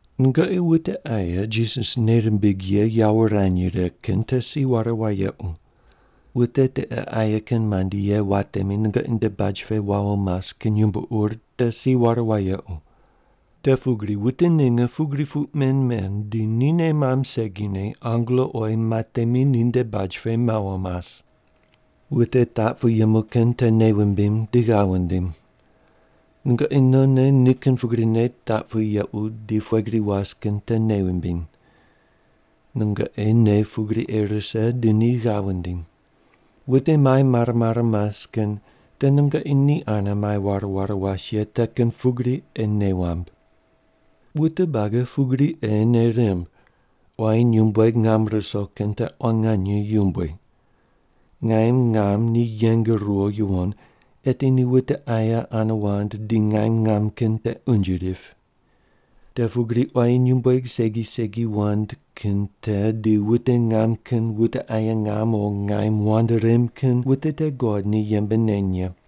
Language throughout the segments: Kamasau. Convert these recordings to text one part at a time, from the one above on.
Nungoqi wute aye Jisas nei rimbig ye yawo wurany righe kin te si ware wayequ. Wute tiqe aye kin mandi ye watemi nungoqi nde baj pe wawo mas kin yumbo ur te si ware wayequ. Te pugri wute ninge pugri puq men men di ni nei mamb segine angelo oyi matemi ninde baj pe mawo mas. Wute taq pu yemu kin te nei wumbim di ghav wundim. Nungoqi nonne ni kin pugrine taq pu yequ di pughe gri was kin te nei wumbiny. Nungoqi nei pugri ei rise di ni ghav wundiny. Wute mai mare mare mas kin te nungoqi ni ane mai ware ware was ye te kin pugri ei nei wamb. Wute buagi pugri ei nei rimb, quayi nyumbueg ngam ruso kin te quan nganye yumbui. Ngaim ngam ni yeng ruwo yuwon, eti ni wute aye ane wand di ngaim ngam kin te unje rip. Te pugri quayi nyumbueg segi segi wand kin te di wute ngam kin wute aye ngam o ngaim wand rem kin wute te God ni yembe neny ye.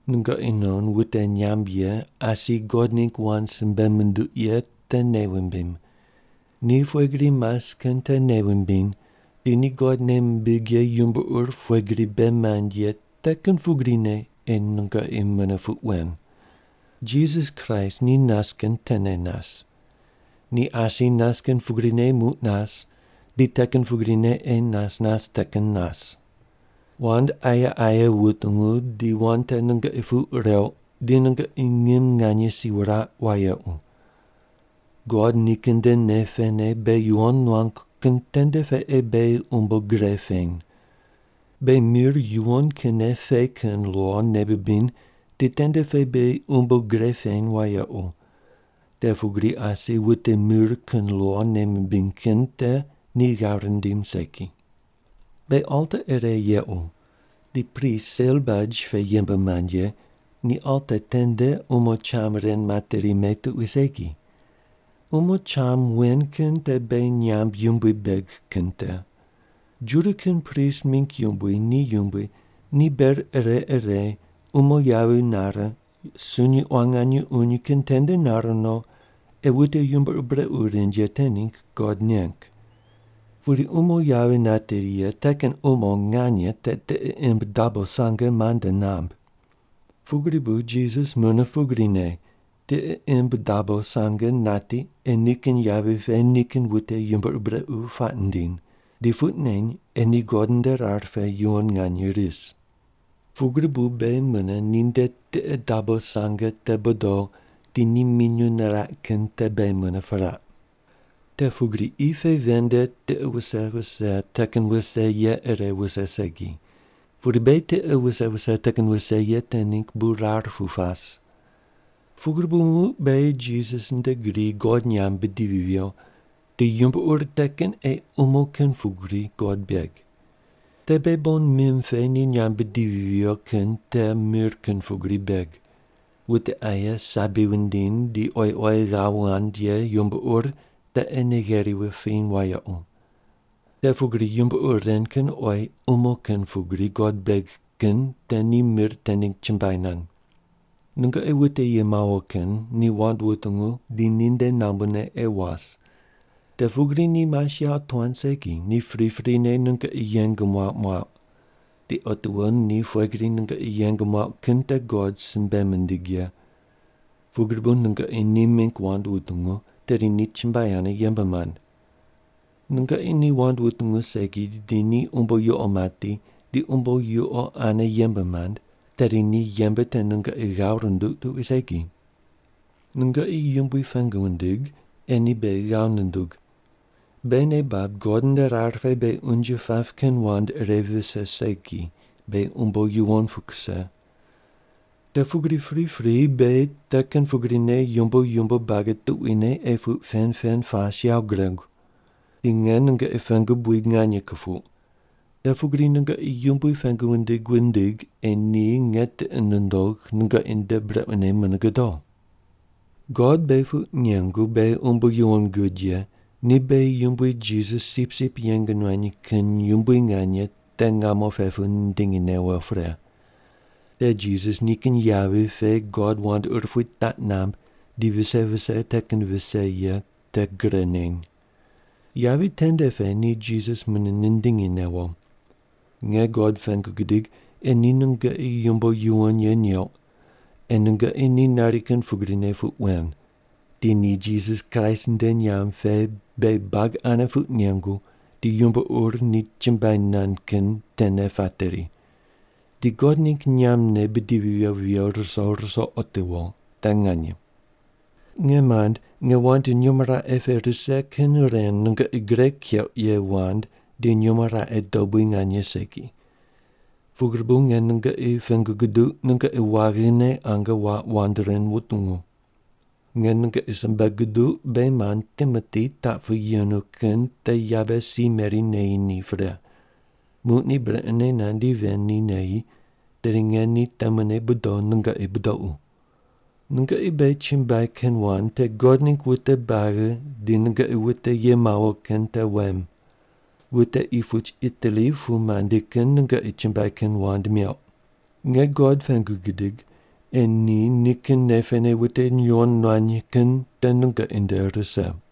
Nungoqi non wute nyamb ye asi God ningg wand simbe munduq ye te nei wumbim. Ni pughe gri mas kin te nei wumbiny di ni God nei mimbig ye yumbo ur pughe gri bei mand ye te kin pugrine ei nungoqi mune puq wen. Jisas Kraist ni nas kin tene nas. Ni asi nas kin pugrine muq nas di te kin pugrine ei nas nas te kin nas. Wand aye aye wutungu di wand te nungoqi puq reuq di nungoqi ngim nganye si wuraq wayequ. God nikin nde nei pene beghi yuwon nuangu kin tende pe ei beghi umbo gre peny. Beghi mir yuwon kinne pe kin lo nei bibiny di tende pe beghi umbo gre peny wayequ, te pugri asi wute mir kin lo nei mimbiny kin te ni ghav rindim segi. Beghi alta ire yequ di prist sel baj pe yembe mand ye ni alta tende umo cham ren materi me tuqui segi. Umo cham wen kin te beghi nyamb yumbui beg kin te. Juda kin prist mingg yumbui ni yumbui ni ber ire ire umo yavi nare sunyi quan nganye uny kin tende nar no ei wute yumbo ur brequ rind ye te ningg God neng. Pudi umo yavi nateri ye te kin umo nganye te tiqe imb dabo sange mande namb. Pugri bu Jisas mune pugrine tiqe imb dabo sange nati ei nikin yavi pe nikin wute yumbo ur brequ puaq nindiny, di puq neny ei ni God nde rar pe yuwon nganye ris. Pugri bu beghi mune ni nde tiqe dabo sange te bodo di ni minyuw niraq kin te beghi mune piraq. Te pugri qi pe ven nde tiqe wuse wuse te kin wuse ye ire wuse segi, pudi beghi tiqe wuse wuse te kin wuse ye te ningg bu rar pu pas. Pugri bu muq beghi Jisas nde gri God nyamb bidivi viyo, di yumbo ur te kin ei umo kin pugri God beg. Te beghi bon mim pe ni nyamb bidivi viyo kin te mir kin pugri beg. Wute aye sabi wundiny di oyi oyi ghav wand ye yumbo ur te ei nei gheri wupiny wayequ. Te pugri yumbo ur ren kin oyi umo kin pugri God beg kin te ni mir te ningg chumbuai nand. Nungoqi wute ye mawo kin ni wand wutungu di ninde nambune ei was. Te pugri ni mas yawotuan segi, ni priprine nungoqi yeng muauq muauq. Di otiwo ni pughe gri nungoqi yeng muauq kin te God simbe mindig ye. Pugri bu nungoqi ni mingg wand wutungu, tedi ni chumbuai ane yembe mand. Nungoqi ni wand wutungu segi di ni umbo yuqo mati di umbo yuqo ane yembe mand, tedi ni yembe te nungoqi ghav runduq tuqui segi. Nungoqi Yumbui pengu wundig ei ni beghi ghav nundug. Beghi nei bab God nde rar pe beghi unje pap kin wand ire vise segi, beghi umbo yuwon pu kuse. Te pugri pripri beghi te kin pugrine yumbo yumbo buagi tuquine ei puq pen pen pas yawo guregu. Di nge nungoqi pengu buid nganye kupuq, te pugri nungoqi Yumbui pengu wundig wundig ei ni nge tiqi nundogh nungoqi nde brequne mune godo. God beghi puq nengu beghi umbo yuwon gud ye ni beghi Yumbui Jisas sipsip yeng nuany kin yumbui nganye te ngamo pe pu nindingi newo pre. Te Jisas nikin yavi pe God wand urupui taq namb di vise vise te kin vise ye te gre neny. Yavi tende pe ni Jisas mune nindingi newo. Nge God pengu gidig ei ni nungoqi yumbo yuwon ye neuq ei nungoqi ni nari kin pugrine puq wen, di ni Jisas Kraist nde nyamb pe beghi buagi ane puq nengu di yumbo ur ni chumbuai nand kin tene pateri. Di God ningg nyambne bidivi viyo viyo ruso ruso otiwo. Te nganye. Nge mand, nge wand nyumo raqe pe rise kin ren nungoqi gre keuq ye wand di nyumo raqe dobui nganye segi. Pugri bu nge nungoqi pengu guduq nungoqi waghine ange waq wand ren wutungu. Nge nungoqi simbe guduq beghi mand Timoti taq pu yenu kin te yabe si meri neyi ni pre. Muq ni brequne nandi ven ni neyi, tedi nge ni temune bodo nungoqi budoqu. Nungoqi beghi chumbuai kin wand te God ningg wute buagi di nungoqi wute ye mawo kin te wem. Wute qi puch Itali pu mandi kin nungoqi chumbuai kin wand meuq. Nge God pengu gidig ei ni nikin nei pene wute yuwon nuany kin te nungoqi nde rise.